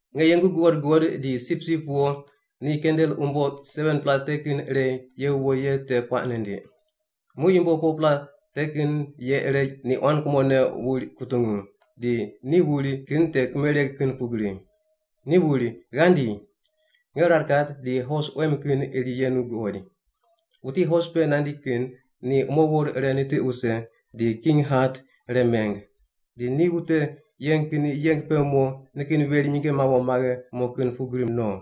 Nge yengu guqod guqod di Sipsip Wo ni kandel umbo 7-pela te kin ire ye wuwo ye te puaq nindiq. Muq yumbo 4-pela te kin ye ire ni quan kumone wuri kutungu, di ni wuri kin te kimereg kin pugri. Ni wuri, “Ghandi!” Nge rar kat di hos quem kin iri yenu guqoid. Wuti hos pe nandi kin ni umowor ire nitiq wuse di king hat ire meng. Di ni wute yeng kin yeng pe mo nikin veri nyinge mawo maghe mo kin pugri no.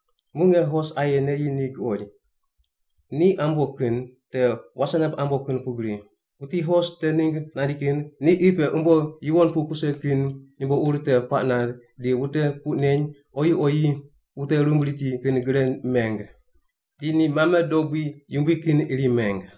Muq nge hos aye neyi ni guqoid. Ni ambo kin, te wase namb ambo kin pugri. Wuti hos te ningg nandi kin ni qi pe umbo yuwon kuse kin yumbo ur te puaq nand di wute puq neny oyi oyi wute rumb riti kin gre meng. Di ni mame dobui yumbui kin iri meng.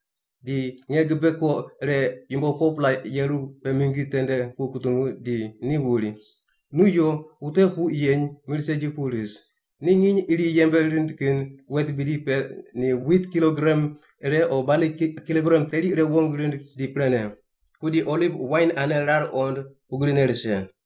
Di nge gibe ko ire yumbo 4-pela yeru pe mingi tende pu kutungu di ni wuri, “Nu yo, wute puq yeny mir segi pu ris. Ni nginy iri yembe rind kin wet bidi pe ni wit kilogram ire o bali kilogram teri irene wong rind di prene. Pudi oliv wain ane rar qond pugrine rise.”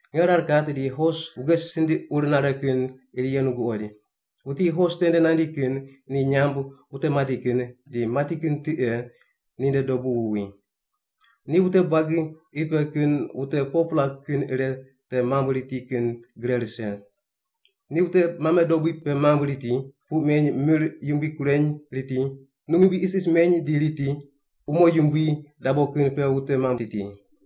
Nge rar kat di hos wuge sindiq ur nare kin iri yenu guqoid. Wuti hos tende nandi kin ni nyamb “Wute Mati Kin,” di “Mati Kin Tiqe” ninde dobu wuwi. Ni wute buagi qi pe kin wute 4-pela kin ire te mamb riti kin gre rise. Ni wute mame dobui pe mamb riti, puq meny mir yumbui kureny riti, num yumbui isis meny di riti, di umo yumbui dabo kin pe wute mamb riti.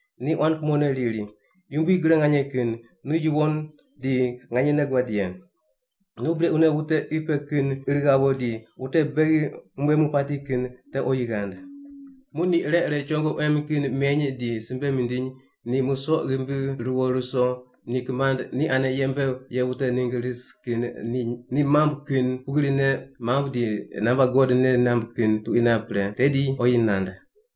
Ni quan kumone riri, “Yumbui Gre Nganye Kin, nu yuwon di nganyene guad ye. Nu brequne wute qi pe kin ir ghawo di wute beghi mumbuemu pati kin te oyi ghand.” Muq ni ire ire chongo quem kin meny di simbe mindiny ni musoq ghimbi ruwo ruso ni kimand ni ane yembe ye wute ningg ris kin ni mamb kin pugrine mamb di namba God nei namb kin tuqui map pre, tedi ni oyi nand.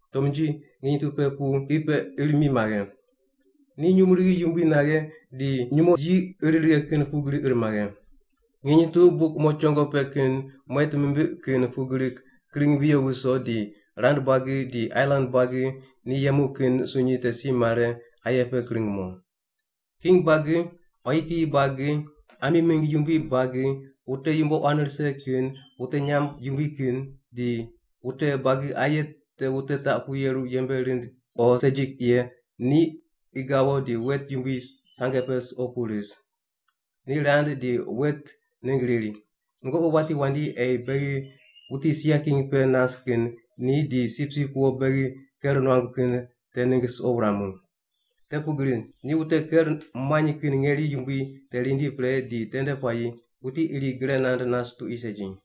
tomnji nginy tu pe pu qi pe ir mi maghe. Ni nyumurighi yumbui naghe di nyumo yi ir righe kin pugri ir maghe. Nginy tu buk umo chongo pe kin muet mimbiq kin pugri kring viyo viso di rand buagi di ailan buagi ni yemu kin sunyi te si mare aye pe kring mo. King buagi, quayi kiyi buagi, ami mingg yumbui buagi, wute yumbo quan rise kin, wute nyamb yumbui kin, di wute buagi aye te wute taq pu yeru yembe rind o segi ye ni qi gawo di wet yumbui sange pe suqo pu ris. Ni rand di wet ningg riri, “Nungoqi wati wandi ei beghi wuti sia king pe nas kin ni di Sipsip Wo beghi ker muangu kin te ningg suqo wuramu. Te pugri ni wute ker muany kin ngeri yumbui te rindi pre di tende puayi wuti iri gre nand nas tuqui segi.”